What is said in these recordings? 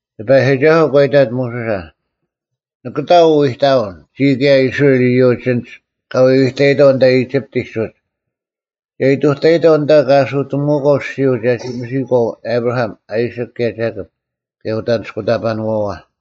ᑎᐸᔨᒋᒐᓱᐤ ᒂ ᐃᑕᑦ ᒧᓱᓴ, “ᓂᑭᑕ ᐅ ᐃᑕᐅᓐ, ᒋᔾ ᑭᔭ ᐃᔅᕋᐃᓪ ᐃᔪᒡ ᐊᓐᒡ ᑲ ᐎᐎᑕᐃᑥᐤ ᐊᓐᑕ ᐃᒋᑉᑎᒡ ᐅᒡ᙮ ᒐ ᐃᑐᑕᐃᑥᐤ ᐊᓐᑕ ᑲ ᐊᓱᑎᒧᐅᒂᐤ ᐊᔅᒋᔪᐤ ᒐᒋ ᒥᔨᒂᐤ ᐊᑉᕋᐊᒻ, ᐊᐃᓯᒃ ᑭᔭ ᒐᑭᑉ, ᑭᔭ ᐅᑦ ᐊᓂᔅᑯᑕᐸᓄᐛᐛ᙮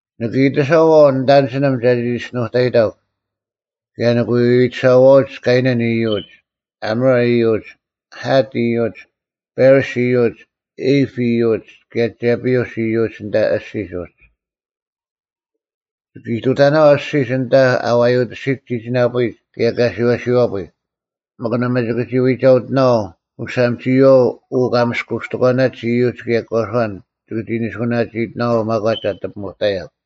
ᓂᑭ ᐃᑎᓴᐛᐤ ᓂᑦ ᐊᓐᒋᓂᒻ ᒐᒋ ᒋᔅᒋᓄᑕᔨᑕᒄ, ᑭᔭ ᓂᑭ ᐎᐎᑎᓴᐛᐅᒡ ᑲᐃᓇᓐ ᐃᔪᒡ, ᐊᒧᕆ ᐃᔪᒡ, ᐊᑦ ᐃᔪᒡ, ᐸᕆᔅ ᐃᔪᒡ, ᐃᑉ ᐃᔪᒡ, ᑭᔭ ᒐᐱᐅᔅ ᐃᔪᒡ ᐊᓐᑕ ᐊᔅᒋᒡ ᐅᒡ᙮ ᒋᑭ ᐃᑐᑕᓇᐛᐤ ᐊᔅᒋᒡ ᐊᓐᑕ ᐊ ᐛᔪᑎᓯᒡ ᒋᒋᓇᐳᔭᐎᒡ ᑭᔭ ᑲᓯᐛᓯᐛᐳᔾ, ᒥᒄ ᓇᒪ ᒋᑭ ᒋ ᐎᒐᐅᑎᓇᐛᐤ ᐅᓴᒻ ᒋᔨᐛᐤ ᐅ ᑲ ᒥᔅᑯᔅᑎᒂᓇᒡ ᐃᔪᒡ ᑭᔭ ᒂᔄᓐ ᒋᑭ ᒋ ᓂᓱᐅᓇᒋᐃᑎᓇᐛᐤ ᒪᒂᒡ ᐊᑎ ᐱᒧᑕᔭᒄ᙮”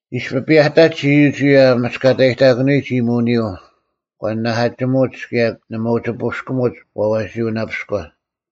ᐃᔅᐱ ᐱᔭᑕᒡ ᐃᔪᒡ ᐅᔭ ᐊᒥᔅᑲᑕᔨᑕᑯᓂᔨᒡ ᐃᔨᒧᐅᓂᔪᐤ, ᒂ ᓂᓇᐧᑲᒋᒧᒡ ᑭᔭ ᓇᒪ ᐅᒋ ᐳᔅᑭᒧᒡ ᐛᐛᓯᐅᓇᐱᔎ᙮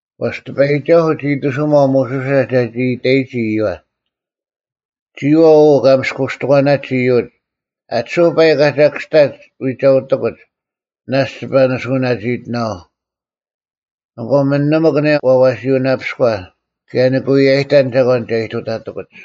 ᐛᔅ ᑎᐸᔨᒋᒐᓱᐤ ᒋ ᐃᑎᓱᒪᐤ ᒧᓱᓴ ᒐᒋ ᐃᑕᔨᒋ ᐃᔪᐛ, “ᒋᔨᐛᐤ ᐅ ᑲ ᒥᔅᑯᔅᑎᒂᓇᒡ ᐃᔪᒡ, ᐊᑎᓱᐧᒄ ᐸᐃᒄ ᐊᒐᐧᑭᔅᑕᒡ ᐎᒐᐅᑎᑯᒡ, ᓇᔅᒡ ᒋᐸ ᓂᓱᐅᓇᒋᐃᑎᓇᐛᐤ᙮ ᐊᑯ ᒥᓂᒥᒄ ᐊᓂᔭ ᐛᐛᓯᐅᓇᐱᔎ, ᑭᔭ ᓂᑭ ᐎᔭᔨᑕᓐ ᒐᒂᓐ ᒐ ᐃᑐᑕᑎᑯᒡ᙮”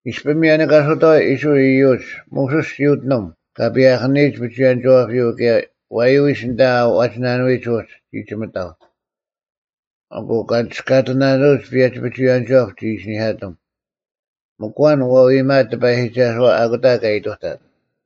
ᐃᔅᐱ ᒥᔭᓂᑲᓱᑥᐎ ᐃᔅᕋᐃᓪ ᐃᔪᒡ, ᒧᓱᔅ ᒋ ᐅᑎᓂᒻ ᑲ ᐸᔭᐧᑭᓂᔨᒡ ᐱᒍᐎᔭᓂᒋᐛᐱᔪᐤ ᑭᔭ ᐛᔪᐎᔅ ᐊᓐᑕ ᐛᒋᓇᓄᐎᒡ ᐅᒡ ᒋ ᒋᒥᑕᐤ᙮ ᐊᑯ ‘ᑲ ᓂᒋᔅᑲᑎᓇᓄᐅᒡ ᐸᔭᒋ ᐱᒍᐎᔭᓂᒥᒋᐛᑉ,’ ᒋ ᐃᓯᓂᐧᑲᑎᒻ᙮ ᒥᒄ ᐊᐛᓐ ᐛ ᐃᔨᒪᐊᑦ ᑎᐸᔨᒋᒐᓱᐛ ᐊᑯᑕ ᑲ ᐃᑐᑕᑦ᙮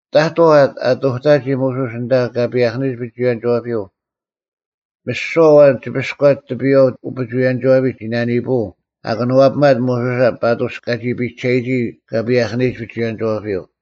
ᑕᑥᐤ ᐊ ᑐᑕᒋ ᒧᓱᔅ ᐊᓐᑕ ᑲ ᐸᔭᐧᑭᓂᔨᒡ ᐱᒍᐎᔭᓂᒋᐛᐱᔪᐤ, ᒥᓯᐛ ᐊᐛᓐ ᒋᐱᔎᒡ ᑎᐱᔨᐛ ᐅᐱᒍᐎᔭᓂᒋᐛᐱᒡ ᒋ ᓇᓂᐳᐤ ᐊ ᑭᓄᐛᐱᒪᑦ ᒧᓱᓴ ᐸᑐᔅ ᑲᒋ ᐱᒐᔨᒋ ᑲ ᐸᔭᐧᑭᓂᔨᒡ ᐱᒍᐎᔭᓂᒋᐛᐱᔪᐤ᙮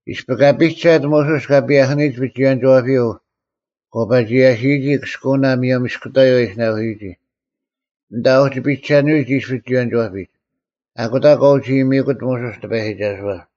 ᐃᔅᐱ ᑲ ᐱᒐᑦ ᒧᓱᔅ ᑲ ᐸᔭᐧᑭᓂᔨᒡ ᐱᒍᐎᔭᓂᒋᐛᐱᔪᐤ ᒂ ᐸᒋ ᔭᓯᐱᔨᒋ ᑭᔅᑯᐅᓇ ᒧᔭᒻ ᐃᔅᑯᑕᔪᐤ ᐊ ᐃᓯᓇᑯᓯᔨᒋ, ᐊᓐᑕ ᐊ ᐅᒋ ᐱᒐᓄᐎᒡ ᐃᔅ ᐱᒍᐎᔭᓂᒋᐛᐱᒡ, ᐊᑯᑕ ᒂ ᐅᒋ ᐃᔨᒥᑯᑦ ᒧᓱᔅ ᑎᐸᔨᒋᒐᓱᐛ᙮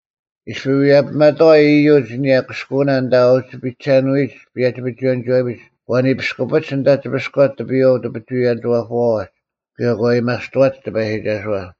ᐃᔅᐱ ᐎᔭᐱᒪᑥᐎ ᐃᔪᒡ ᐊᓂᔭ ᑭᔅᑯᐅᓇ ᐊᓐᑕ ᐊ ᐅᒋ ᐱᒐᓄᐎᒡ ᐸᔭᒋ ᐱᒍᐎᔭᓂᒋᐛᐱᒡ ᒂ ᓂᐱᔅᑯᐱᒡ ᐊᓐᑕ ᒋᐱᔎᒡ ᑎᐱᔨᐛ ᐅᐱᒍᐎᔭᓂᒋᐛᐳᐛᐛᒡ ᑭᔭ ᒂ ᐊᔭᒥᐊᔅᑐᐛᒡ ᑎᐸᔨᒋᒐᓱᐛ᙮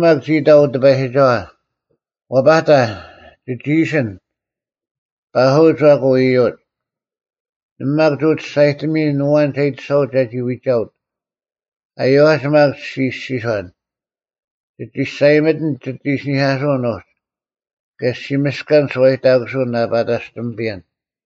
ᒧᓱᔅ ᒪᒃ ᒋ ᐃᑕᐤ ᐅᑎᐸᔨᒋᒐᐛ, “ᐛᐸᑕ, ᒋᒋ ᐃᓯᓐ, ‘ᐸᓱᐅᒡ ᐊᑯ ᐃᔪᒡ᙮’ ᓇᒪ ᒪᒃ ᒋ ᒋᔅᒐᔨᑎᒥᔨᓐ ᐊᐛᓐ ᒐ ᐃᑎᓴᐅᑦ ᒐᒋ ᐎᒐᐅᑦ᙮ ᐊᔪᐛᒡ ᒪᒃ ᔅᒋ ᐃᔅᒋᔄᓐ, ‘ᒋ ᒋᔅᒐᔨᒥᑎᓐ ᒋᑦ ᐃᓯᓂᐧᑲᓱᐅᓐ ᐅᒡ, ᑭᔭ ᔅᒋ ᒥᔅᑲᓐ ᓱᐛᔨᑕᑯᓱᐅᓐ ᐊ ᐸᑕᔅᑎᒥᐱᔭᓐ᙮’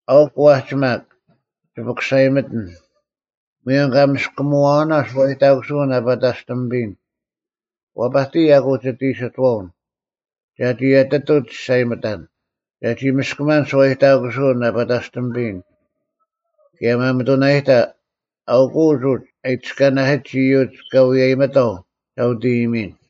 ᐊᐅᒄ ᐛᒋ ᒪᒃ, ᒋ ᐱᑯᓴᔨᒥᑎᓐ, ᒧᔭᒻ ᑲ ᒥᔅᑯᒧᐛᓇ ᓱᐛᔨᑕᑯᓱᐅᓐ ᐊ ᐸᑕᔅᑎᒥᐱᔨᓐ, ᐛᐸᑎᔨ ᐊᑯ ᒋᑦ ᐃᓯᑥᐅᓐ, ᒐᒋ ᐊᑎᑐᐤ ᒋᔅᒐᔨᒥᑕᓐ, ᒐᒋ ᒥᔅᑲᒪᓐ ᓱᐛᔨᑕᑯᓱᐅᓐ ᐊ ᐸᑕᔅᑎᒪᐱᔨᓐ; ᑭᔭ ᒪᒥᑐᓇᔨᑕ, ᐊᐅᑯᐤ ᐅᒡ ᐊ ᐃᑎᔅᑲᓇᓯᒡ ᐃᔪᒡ ᑲ ᐎᔭᔨᒥᑥᐤ ᒐ ᐅᑦ ᐃᔨᒥᔨᓐ᙮”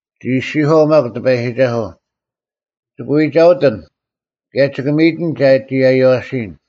ᒋ ᐃᔅᒋᔄᐤ ᒪᒃ ᑎᐸᔨᒋᒐᓱᐤ, “ᒋᑭ ᐎᒐᐅᑎᓐ, ᑭᔭ ᒋᑭ ᒥᔨᑎᓐ ᒐᒋ ᐊᔽᓯᔨᓐ᙮”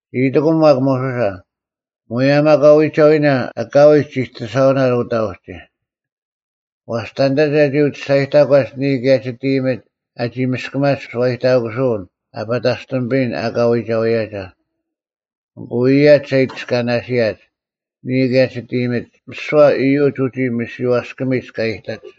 ᒋ ᐃᑎᑯᐤ ᒪᒃ ᒧᓱᓴ, “ᒧᔭᒻ ᐊᑲ ᐎᒐᐎᓇ, ᐊᑲᐎᔾ ᒋᑎᓴᐅᓇᓐ ᐅᑕ ᐅᒋ᙮ ᐛᔅ ᑕᓐᑕ ᒐ ᐅᒋ ᒋᔅᒐᔨᑕᒂᒡ ᓂᔾ ᑭᔭ ᒋᑦ ᐃᔨᒥᒡ ᐊᒋ ᒥᔅᑲᒪᒡ ᓴᐛᔨᑕᑯᓯᐅᓐ ᐊ ᐸᑕᔅᑎᒪᐱᔨᓐ ᐊᑲ ᐎᒐᐎᔭᒐ? ᐊᑯ ᐃᔭᒡ ᒐ ᐃᑎᔅᑲᓂᓯᔭᒡ, ᓂᔾ ᑭᔭ ᒋᑦ ᐃᔨᒥᒡ, ᒥᓯᐛ ᐃᔪᒡ ᐅᒋ ᒥᓯᐛᔅᑭᒥᒡ ᑲ ᐃᑕᒡ᙮”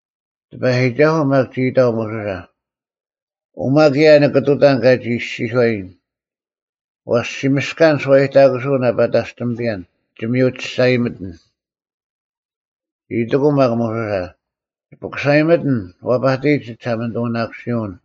ᑎᐸᔨᒋᒐᓱᐤ ᒪᒃ ᒋ ᐃᑕᐤ ᒧᓱᓴ, “ᐅᒪ ᑭᔭ ᓂᑭ ᑐᑕᓐ ᑲᒋ ᐃᔅᒋᔄᔨᓐ: ᐛᔅ ᔅᒋ ᒥᔅᑲᓐ ᓱᐛᔨᑕᑯᓱᐅᓐ ᐊ ᐸᑕᔅᑎᒥᐱᔭᓐ, ᒋ ᒥᔪ ᒋᔅᒐᔨᒥᑎᓐ᙮” ᒋ ᐃᑎᑯᐤ ᒪᒃ ᒧᓱᓴ, “ᒋ ᐱᑯᓴᔨᒥᑎᓐ, ᐛᐸᑎᔨ ᒋ ᒋᓴᒪᓂᑐᓇᑯᓯᐅᓐ᙮”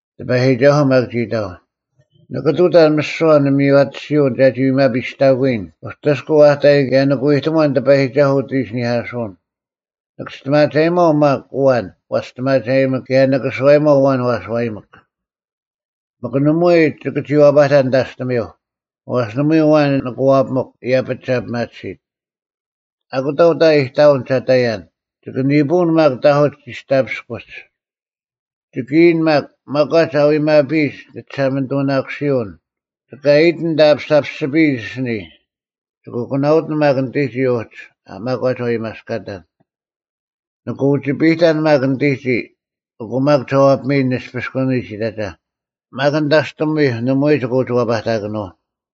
ᑎᐸᔨᒋᒐᓱᐤ ᒪᒃ ᒋ ᐃᑕᐤ, “ᓂᑭ ᑐᑕᓐ ᒥᓯᐛ ᓂᒥᔽᑎᓯᐅᓐ ᒐᒋ ᐎᒪᐱᔨᔅᑕᑯᔨᓐ ᐅᑎᔅᑯᐤ ᐊᑕᔨᓐ ᑭᔭ ᓂᑭ ᐎᑕᒺᓐ ᑎᐸᔨᒋᒐᓱᐤ ᐅᑦ ᐃᓯᓂᐧᑲᓱᐅᓐ: ᓂᑭ ᒋᔅᑎᒪᒐᔨᒪᐤ ᒪᒃ ᐊᐛᓐ ᐛ ᒋᔅᑎᒪᒐᔨᒥᒃ ᑭᔭ ᓂᑭ ᓱᐛᔨᒪᐤ ᐊᐛᓐ ᐛ ᓱᐛᔨᒥᒃ᙮ ᒥᒄ ᓇᒪᐎᔾ ᒋᑭ ᒋ ᐛᐸᑕᓐ ᓂᑕᔅᑎᒥᐧᒄ: ᐛᔅ ᓇᒪ ᐎ ᐊᐛᓐ ᓂᑭ ᐛᐱᒥᒄ, ᐃᔭᐱᒡ ᒐ ᐱᒪᑎᓯᑦ᙮ ᐊᑯᑕ ᐅᑕ ᐃᑕᐅᓐ ᒐ ᑕᔭᓐ, ᒋᑭ ᓂᐳᐅᓐ ᒪᒃ ᑕᐧᑯᒡ ᒋᔅᑕᐱᔅᑯᒡ᙮ ᒋᑭ ᐃᔨᓐ ᒪᒃ, ᒪᒂᒡ ᐊ ᐎᒪᐱᔨᒡ ᓂᒋᓴᒪᓂᑐᓇᑯᓯᐅᓐ, ᒋᑭ ᐊᐃᑎᓐ ᐊᓐᑕ ᐊᐱᓴᐱᔅᒋᐱᔨᒡ ᐊᓯᓂᔾ: ᒋᑭ ᐊᑯᐛᓇᐅᑎᓐ ᒪᒃ ᓂᑎᒋᔾ ᐅᒋ ᒪᒂᒡ ᐊ ᐎᒪᔅᑲᑕᓐ᙮ ᓂᑭ ᐅᒋᐱᔨᑕᓐ ᒪᒃ ᓂᑎᒋᔾ, ᐊᑯ ᒪᒃ ᒐ ᐛᐱᒥᔨᓐ ᓂᔅᐱᔅᑯᓂᒡ ᐃᑕᒐ: ᒪᒃ ᓂᑕᔅᑎᒥᐧᒄ ᓇᒪᐎᔾ ᒋᑭ ᒋ ᐛᐸᑕᑭᓄᐤ᙮”